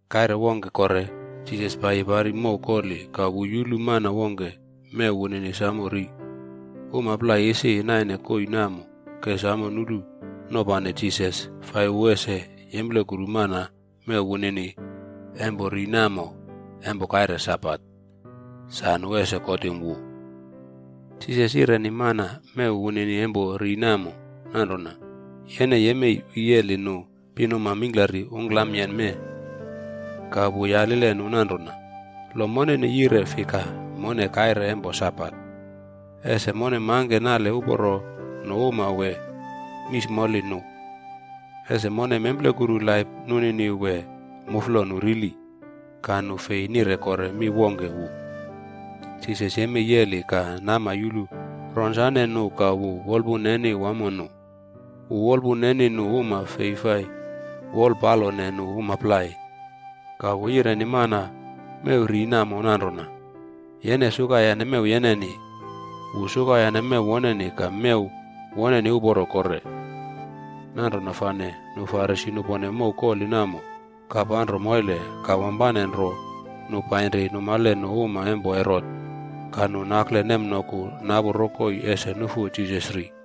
Kaire wongke kore Jisas paiyi pari mow koli ka wu yulu mana wongke mew wunini samo ri. Uma plai isi naine koii namo ke samo nulu nopane Jisas fai wu ese yemplekuru mana mew wunini empo ri namo empo kaire Sabat, sa nu ese kotim wu. Jisas yireni mana mew wunini empo ri namo nanrona, “Yene yemei wiyeli nu pinuma mingklari ungklamayen mee.” Ka wu yalile nu nanrona, “Lo moneni yire fika mone kaire empo Sabat? Ese mone mangke nale uporo nu uma wee mismoli nu? Ese mone memplekuru laip nunini wee muflo nu rili?” Ka nu fei nire kore mi wongke wu. Jisas yemei yeli ka nama yulu ronsane nu ka wu wolpun neni wamo nu. Wu wolpun neni nu uma fei fai wolpalone nu uma plai. Ka wu yireni mana mew ri namo nanrona, “Yene sukayane mew yeneni.” Wu sukayane mew woneni ka mew woneni uporo kore. Nanrona fane nu Farisi nupone mow koli namo ka panro moile ka wampane nro nu painri numale nu uma empo Herot. Ka nu nakle nemnoku napu rokoi ese nufu Jisas ri.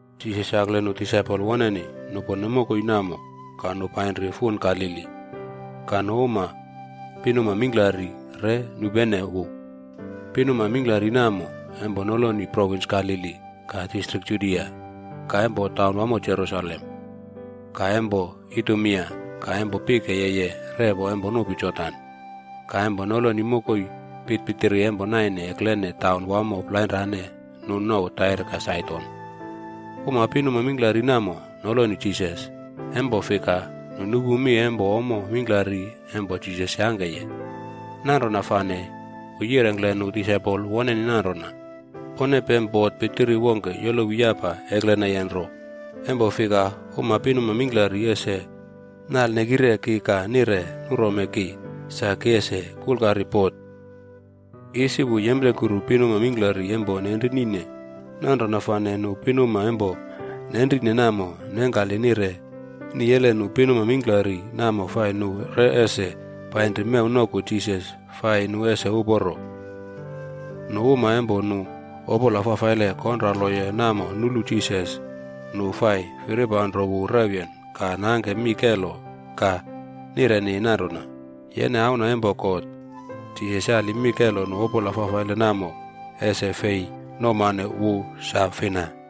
Jisas yakle nu disaipol woneni nupone mokoi namo ka nu painri fun Galili. Ka uma pinuma mingklari re nupenene wu. Pinuma mingklari namo empo noloni provins Galili, ka distrik Judia, ka empo taunwamo Jerusalem, ka empo Idumea, ka empo pike yeye repo empo nupi Jordan, ka empo noloni mokoi pitpitiri empo naine eklene taun wamo plainrane nu nouw Tair ka Saidon. Uma pinuma mingklari namo noloni Jisas, empo fika nu nupu mi empo ommo mingklari empo Jisas yangkeye. Nanrona fane wu yirengkle nu disaipol woneni nanrona, pone pem bot pitiri wongke yolowi yapa ekleneye nro, empo fika uma pinuma mingklari ese nalnekire ki ka nire nurome ki, sa ki ese kulkari bot. Isi wu yemplekuru pinuma mingklari empo nenrinine. Nanrona fane nu pinuma empo nenrine namo nengkali nire niyele nu pinuma mingklari namo fai nu re ese painri mew noku Jisas fai nu ese uporo. Nu uma empo nu opola fafaile konraloye namo nulu Jisas, nu fai firipanro wu rewyen ka nangke mi kelo ka nireni nanrona, “Yene Auna empo God!” Jisas yali mi kelo nu opola fafaile namo ese fei nouwmane wu sa fina.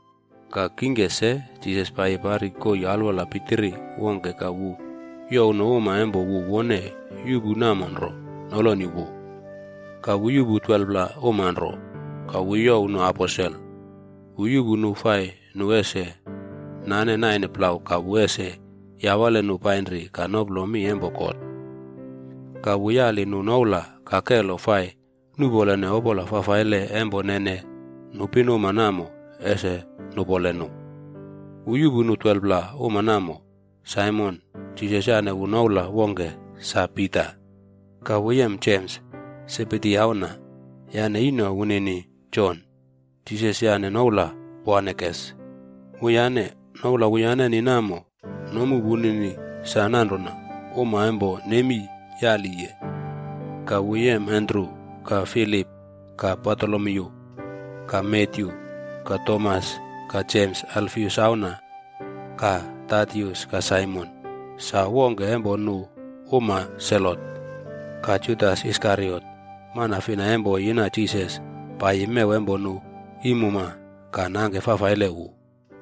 Ka kingke se Jisas paiyi pari koii alwola pitiri wongke ka wu youw nu uma empo wu wone yuꞌpu namo nro, noloni wu. Ka wu yuꞌpu 12pla uma nro, ka wu youw nu “aposel.” Wu yuꞌpu nu fai nu ese nane naine plau ka wu ese yawale nu painri ka noplo mi empo God, ka wu yali nu noula ka kelo fai nuꞌpolene opola fafaile empo nene nu pinuma namo ese nupole nu. Wu yuꞌpu nu 12pla uma namo. Saimon (Jisas yane wu noula wongke sa Pita), ka wu yem Jems, Sebedi auna, yane ino wunini Jon, Jisas yane noula “Boanerges” wuyane. Noula wuyaneni namo nomu wunini sa nanrona Uma Empo Nemi Yaliye. Ka wu yem Andru, ka Filip, ka Bartolomyu, ka Matyu, ka Tomas, ka Jems Alfius auna, ka Tadius ka Saimon, sa wongke empo nu uma Selot, ka Judas Iskariot, mana fina empo yina Jisas paiyi mew empo nu iim uma ka nangke fafaile wu.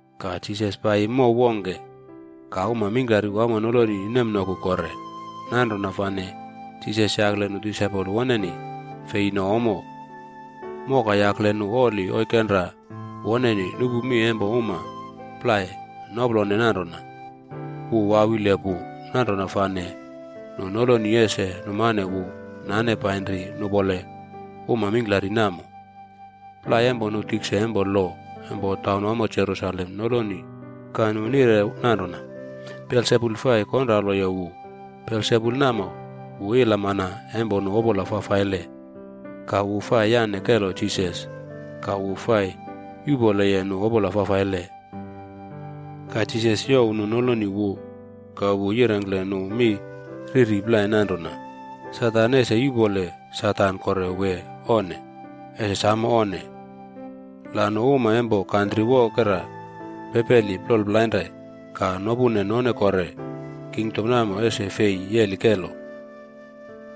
Ka Jisas paiyi mow wongke. Ka uma mingklari wamo noloni nemnoku kore. Nanrona fane Jisas yakle nu disaipol woneni fei no ommo. Moka yakle nu oli oikenra woneni nupu mi empo uma plai noplone nanrona, wu wawile pu. Nanrona fane nu noloni ese numane wu nane painri nupole uma mingklari namo. Plai empo nu tikse empo lo empo taunwamo Jerusalem noloni ka nu nire nanrona, “Belsebul fai konraloye wu. Belsebul namo wu ilamana empo nu opola fafaile, ka wu fai yane kelo Jisas ka wu fai yuꞌpoleye nu opola fafaile.” Ka Jisas youw nu noloni wu ka wu yirengkle nu mi riri plai nanrona, “Satan ese yuꞌpole Satan kore wee onne? Ese samo onne! La nu uma empo kantri wokera pepeli plol plainre ka nopune none kore, kingdom namo ese fei yeli kelo.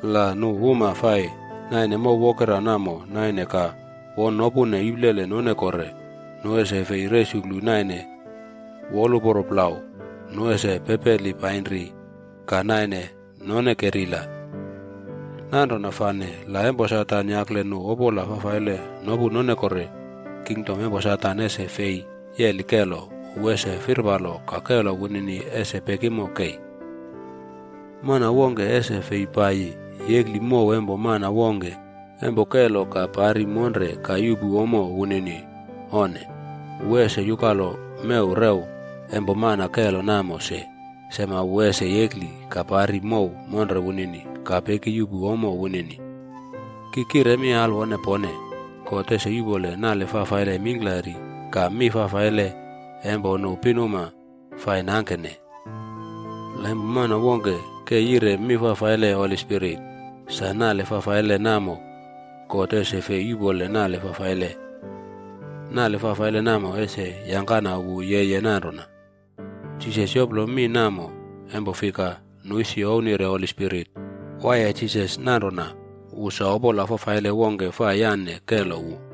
La nu uma fai naine mow wokera namo naine ka won nopune iplele none kore, nu ese fei resuklu naine woluporo plau, nu ese pepeli painri ka naine none kerila. Nanrona fane la empo Satan yakle nu opola fafaile nopu none kore, kingdom empo Satan ese fei yeli kelo. Wu ese firpalo ka kelo wunini ese pekimo kei.” “Mana wongkea ese fei paiyi yekli mow empo mana wongke empo kelo ka pari monre ka yuꞌpu ommo wunini. Onne. Wu ese yukalo mew rew empo mana kelo namo se, sema wu ese yekli ka pari mow monre wunini ka pekiyuꞌpu ommo wunini.” “Ki kire mi alwone pone, God ese yuꞌpole nale fafaile mingklari ka mi fafaile empo nu pinuma fai nangkene. La empo mana wongke ke yire mi fafaile Holi Spirit, sa nale fafaile namo God ese fei yuꞌpole nale fafaile. Nale fafaile namo ese yangkana wu yeye nanrona.” Jisas yoplo mi namo empo fika nu isi ouwnire Holi Spirit waiye Jisas nanrona wu sa opola fafaile wongke fai yane kelo wu.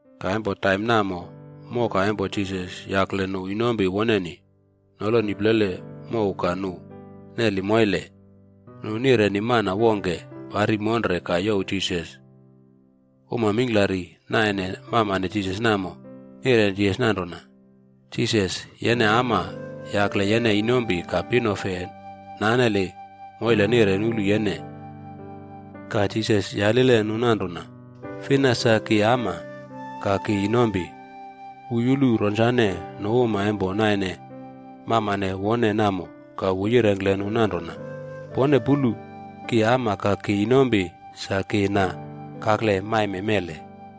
Ka empo taim namo moka empo Jisas yakle nu inompi woneni noloni plele mow ka nu neli moile. Nu nireni mana wongke pari monre ka youw Jisas. Uma mingklari naine mamane Jisas namo, nireni Jisas nanrona, “Jisas, yene ama yakle yene inompi ka pinofe naneli moile nire nulu yene.” Ka Jisas yaline nu nanrona, “Fina sa ki ama ka ki inompi?” Wu yulu ronsane nu uma empo naine mamane wone namo ka wu yirengkle nu nanrona, “Pone pulu, ki ama ka ki inompi sa ki na kakle maime mele.